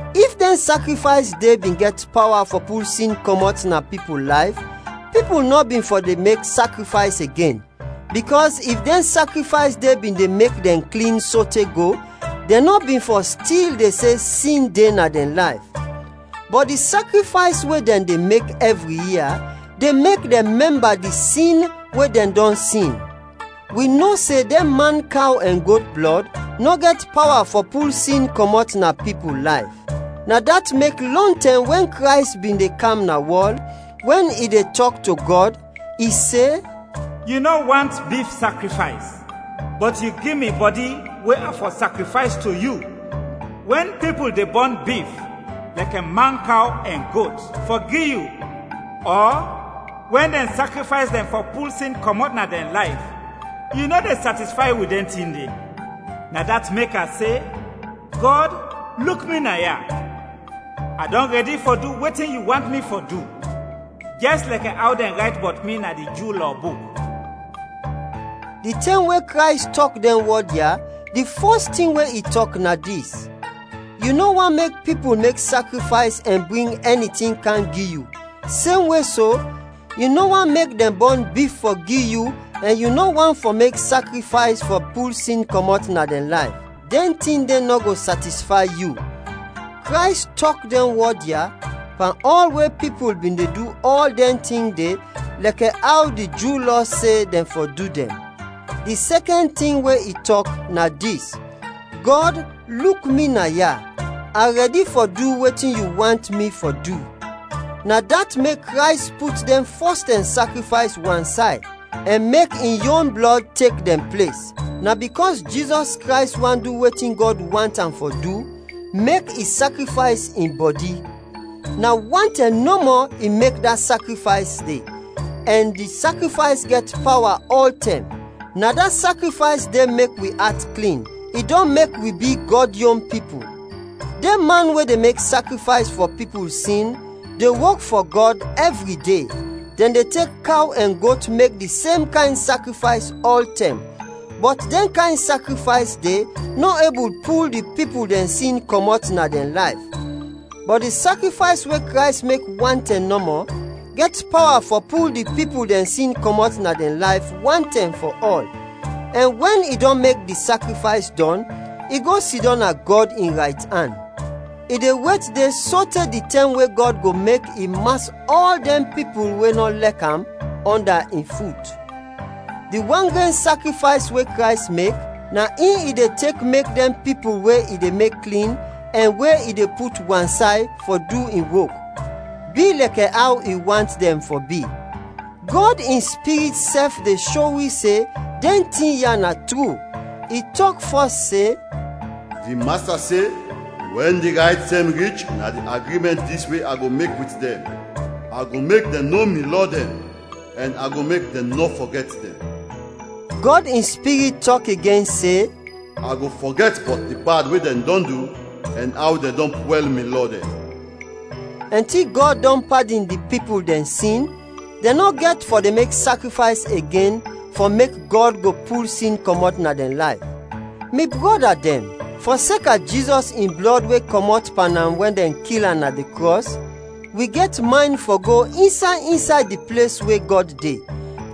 If dɛn sakrifays de bin gɛt pawa fɔ pul sin kɔmɔt na pipul layf, pipul nɔ bin fɔ de mek sakrifays igen, bikɔs if dɛn sakrifays de bin de mek dɛn klin sote go, dɛn nɔ bin fɔ stil de se sin de na dɛn layf. Bɔt di sakrifays we dɛn de mek ɛvri ia, de mek dɛn mɛmba di sin we dɛn dɔn sin. Wi no se dɛn mankaw ɛn got blɔd nɔ gɛt pawa fɔ pul sin kɔmɔt na pipul layf. Na dat mek lɔntɛm wɛn Krays bin de kam na wɔl, wɛn i de tɔk to Gɔd, i se, “Yu nɔ want bif sakrifays, bɔt yu gi mi bɔdi we a fɔ sakrifays to yu. Wɛn pipul de bɔn bif, lɛkɛ mankaw ɛn got, fɔ gi yu ɔ wɛn dɛn sakrifays dɛn fɔ pul sin kɔmɔt na dɛn layf, yu nɔ de satisfay wit dɛn tin de. Na dat mek a se, ‘Gɔd, luk mi naya, a dɔn rɛdi fɔ du wetin yu want mi fɔ du, jɛs lɛkɛ aw dɛn rayt bɔt mi na di Ju Lɔ buk.’” Di tɛm we Krays tɔk dɛn wɔd ya, di fɔs tin we i tɔk na dis: “Yu nɔ want mek pipul mek sakrifays ɛn bring ɛni tin kam gi yu; semwe so, yu nɔ want mek dɛn bɔn bif fɔ gi yu ɛn yu nɔ want fɔ mek dɛn mek sakrifays fɔ pul sin kɔmɔt na dɛn layf. Dɛn tin de nɔ go satisfay yu.” Krays tɔk dɛn wɔd ya, pan ɔl we pipul bin de du ɔl dɛn tin de lɛkɛ aw di Ju Lɔ se dɛn fɔ du dɛn. Di sɛkɛn tin we i tɔk, na dis: “Gɔd, luk mi naya, a rɛdi fɔ du wetin yu want mi fɔ du.” Na dat mek Krays put dɛn fɔstɛm sakrifays wansay, ɛn mek in yon blɔd tek dɛn ples. Na bikɔs Jizɔs Krays want du wetin Gɔd want am fɔ du, mek i sakrifays in bɔdi. Na wan tɛm nɔmɔ i mek da sakrifays de ɛn di sakrifays gɛt pawa ɔltɛm. Na da sakrifays de mek wi at klin. I dɔn mek wi bi Gɔd yon pipul. Dɛn man we de mek sakrifays fɔ pipul sin de wok fɔ Gɔd ɛvri de, dɛn de tek kaw ɛn got mek di sem kayn sakrifays ɔltɛm, bɔt dɛn kayn sakrifays de, nɔ ebul pul di pipul dɛn sin kɔmɔt na dɛn layf. Bɔt di sakrifays we Krays mek wan tɛm nɔmɔ, gɛt pawa fɔ pul di pipul dɛn sin kɔmɔt na dɛn layf, wan tɛm fɔ ɔl, ɛn wɛn i dɔn mek di sakrifays dɔn, i go sidɔm na Gɔd in raytan. I de wet de sote di tɛm we Gɔd go mek i mas ɔl dɛn pipul we nɔ lɛk am ɔnda in fut. Di wan gren sakrifays we Krays mek, na in i de tek mek dɛn pipul we i de mek klin ɛn we i de put wansay fɔ du in wok, bi lɛkɛ aw i want dɛn fɔ bi. Gɔd in Spirit sɛf de sho wi se dɛn tin ya na tru. I tɔk fɔs se, “Di Masta se, ‘Wɛn di rayt tɛm rich, na di agrimɛnt dis we a go mek wit dɛn: A go mek dɛn no mi lɔ dɛn, ɛn a go mek dɛn nɔ fɔgɛt dɛn.’” Gɔd in Spirit tɔk igen se, “A go fɔgɛt bɔt di bad we dɛn dɔn du ɛn aw dɛn dɔn pwɛl mi lɔ dɛn.” Ɛnti Gɔd dɔn padin di pipul dɛn sin, dɛn nɔ gɛt fɔ de mek sakrifays igen fɔ mek Gɔd go pul sin kɔmɔt na dɛn layf. Mi brɔda dɛn, fɔseka Jizɔs in blɔd we kɔmɔt pan am wɛn dɛn kil am na di krɔs, wi gɛt maynd fɔ go insay, insay di ples we Gɔd de.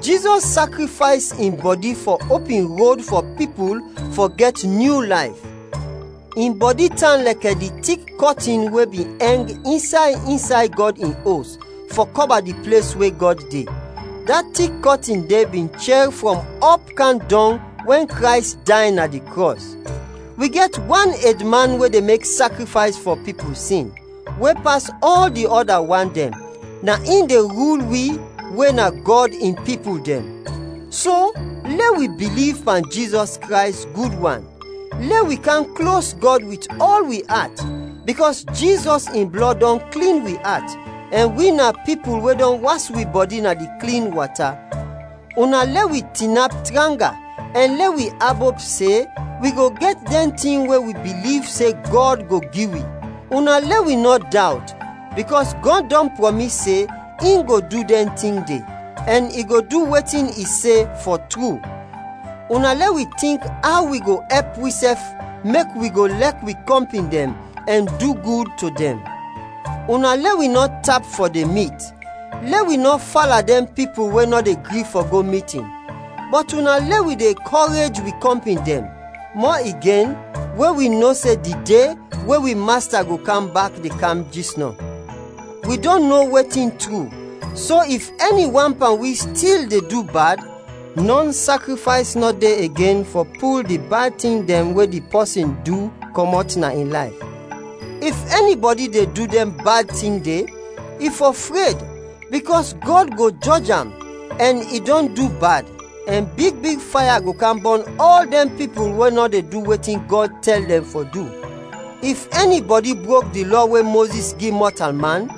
Jizɔs sakrifays in bɔdi fɔ opin rod fɔ pipul fɔ gɛt nyu layf. In bɔdi tan lɛkɛ di tik kɔtin we bin ɛng insay, insay Gɔd in Os fɔ kɔba di ples we Gɔd de. (Da tik kɔtin de bin chɛr frɔm ɔp kam dɔng wɛn Krays day na di krɔs.) Wi gɛt wan edman we de mek sakrifays fɔ pipul sin, we pas ɔl di ɔda wan dɛn; na in de rul wi we na Gɔd in pipul dɛn. So, lɛ wi biliv pan Jizɔs Krays gud wan; lɛ wi kam klos Gɔd wit ɔl wi at, bikɔs Jizɔs in blɔd dɔn klin wi at; ɛn wi na pipul we dɔn was wi bɔdi na di klin wata. Una lɛ wi tinap tranga, ɛn lɛ wi abop se wi go gɛt dɛn tin we wi biliv se Gɔd go gi wi. Una lɛ wi nɔ dawt bikɔs Gɔd dɔn prɔmis se in go du dɛn tin de, ɛn i go du wetin i se, fɔ tru. Una lɛ wi tink aw wi go ɛp wisɛf mek wi go lɛk wi kɔmpin dɛn ɛn du gud to dɛn. Una lɛ wi nɔ tap fɔ de mit, lɛ wi nɔ fala dɛn pipul we nɔ de gri fɔ go mitin. Bɔt una lɛ wi de kɔrej wi kɔmpin dɛn, mɔ igen we wi no se di De we wi Masta go kam bak de kam jisnɔ. Wi dɔn no wetin tru, so if ɛni wan pan wi stil de du bad, nɔn sakrifays nɔ de igen fɔ pul di bad tin dɛn we di pɔsin du kɔmɔt na in layf. If ɛnibɔdi de du dɛn bad tin de, i fɔ fred, bikɔs Gɔd go jɔj am ɛn se i dɔn du bad, ɛn big big faya go kam bɔn ɔl dɛn pipul we nɔ de du wetin Gɔd tɛl dɛn fɔ du. If ɛnibɔdi brok di Lɔ we Mozis gi mɔtalman,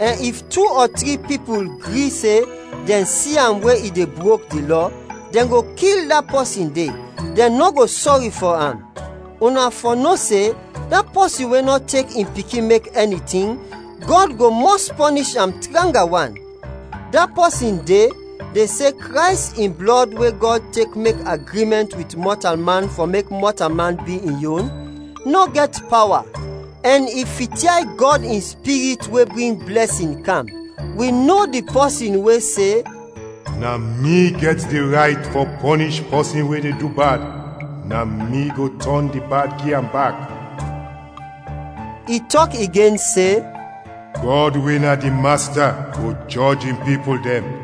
ɛn if tu ɔ tri pipul gri se dɛn si am we i de brok di Lɔ, dɛn go kil da pɔsin de, dɛn nɔ go sɔri fɔ am. Una fɔ no se, da pɔsin we nɔ tek in Pikin mek ɛni tin, Gɔd go mɔs pɔnish am tranga wan; da pɔsin de de se Krays in blɔd we Gɔd tek mek agrimɛnt wit mɔtalman fɔ mek mɔtalman bi in yon, nɔ gɛt pawa; ɛn i fityay Gɔd in Spirit we bring blɛsin kam. Wi no di pɔsin we se, “Na mi gɛt di rayt fɔ pɔnish pɔsin we de du bad, na mi go tɔn di bad gi am bak.” I tɔk igen se, “Gɔd we na di Masta go jɔj in pipul dɛn.”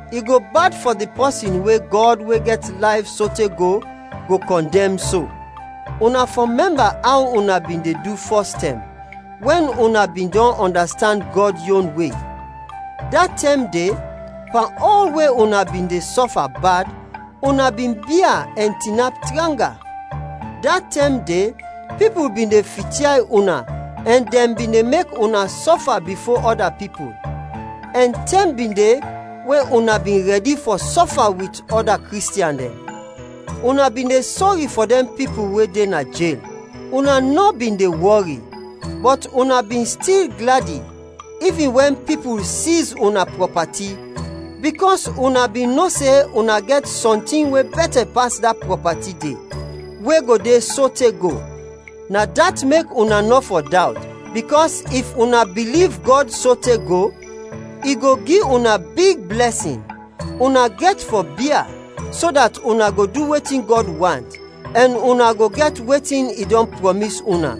I go bad fɔ di pɔsin we Gɔd we gɛt layf sote go, go kɔndɛm so. Una fɔ mɛmba aw una bin de du fɔstɛm, wɛn una bin dɔn ɔndastand Gɔd yon we. Da tɛm de, pan ɔl we una bin de sɔfa bad, una bin bia ɛn tinap tranga. Da tɛm de pipul bin de fityay una ɛn dɛn bin de mek una sɔfa bifo ɔda pipul, ɛn tɛm bin de we una bin rɛdi fɔ sɔfa wit ɔda Kristiɛn dɛn. Una bin de sɔri fɔ dɛn pipul we de na jel, una nɔ bin de wɔri, bɔt una bin stil gladi ivin wɛn pipul siz una prɔpati, bikɔs una bin no se una gɛt sɔntin we bɛtɛ pas da prɔpati de, we go de sote go. Na dat mek una nɔ fɔ dawt, bikɔs if una biliv Gɔd sote go, i go gi una big blɛsin. Una gɛt fɔ bia, so dat una go du wetin Gɔd want, ɛn una go gɛt wetin i dɔn prɔmis una.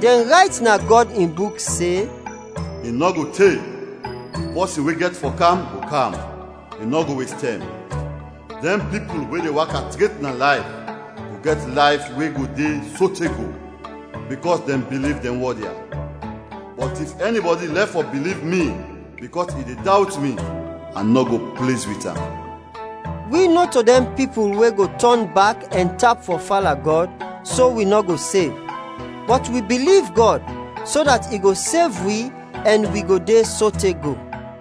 Dɛn rayt na Gɔd in Buk se, “I nɔ go te, di pɔsin we gɛt fɔ kam, go kam; i nɔ go wes tɛm. Dɛn pipul we de waka tret na layf go gɛt layf we go de sote go, bikɔs dɛn biliv dɛn wɔd ya; bɔt if ɛnibɔdi lɛf fɔ biliv mi bikɔs i de dawt mi, a nɔ go pliz wit am.” Wi nɔto dɛn pipul we go tɔn bak ɛn tap fɔ fala Gɔd, so wi nɔ go sev. Bɔt wi biliv Gɔd, so dat i go sev wi ɛn wi go de sote go.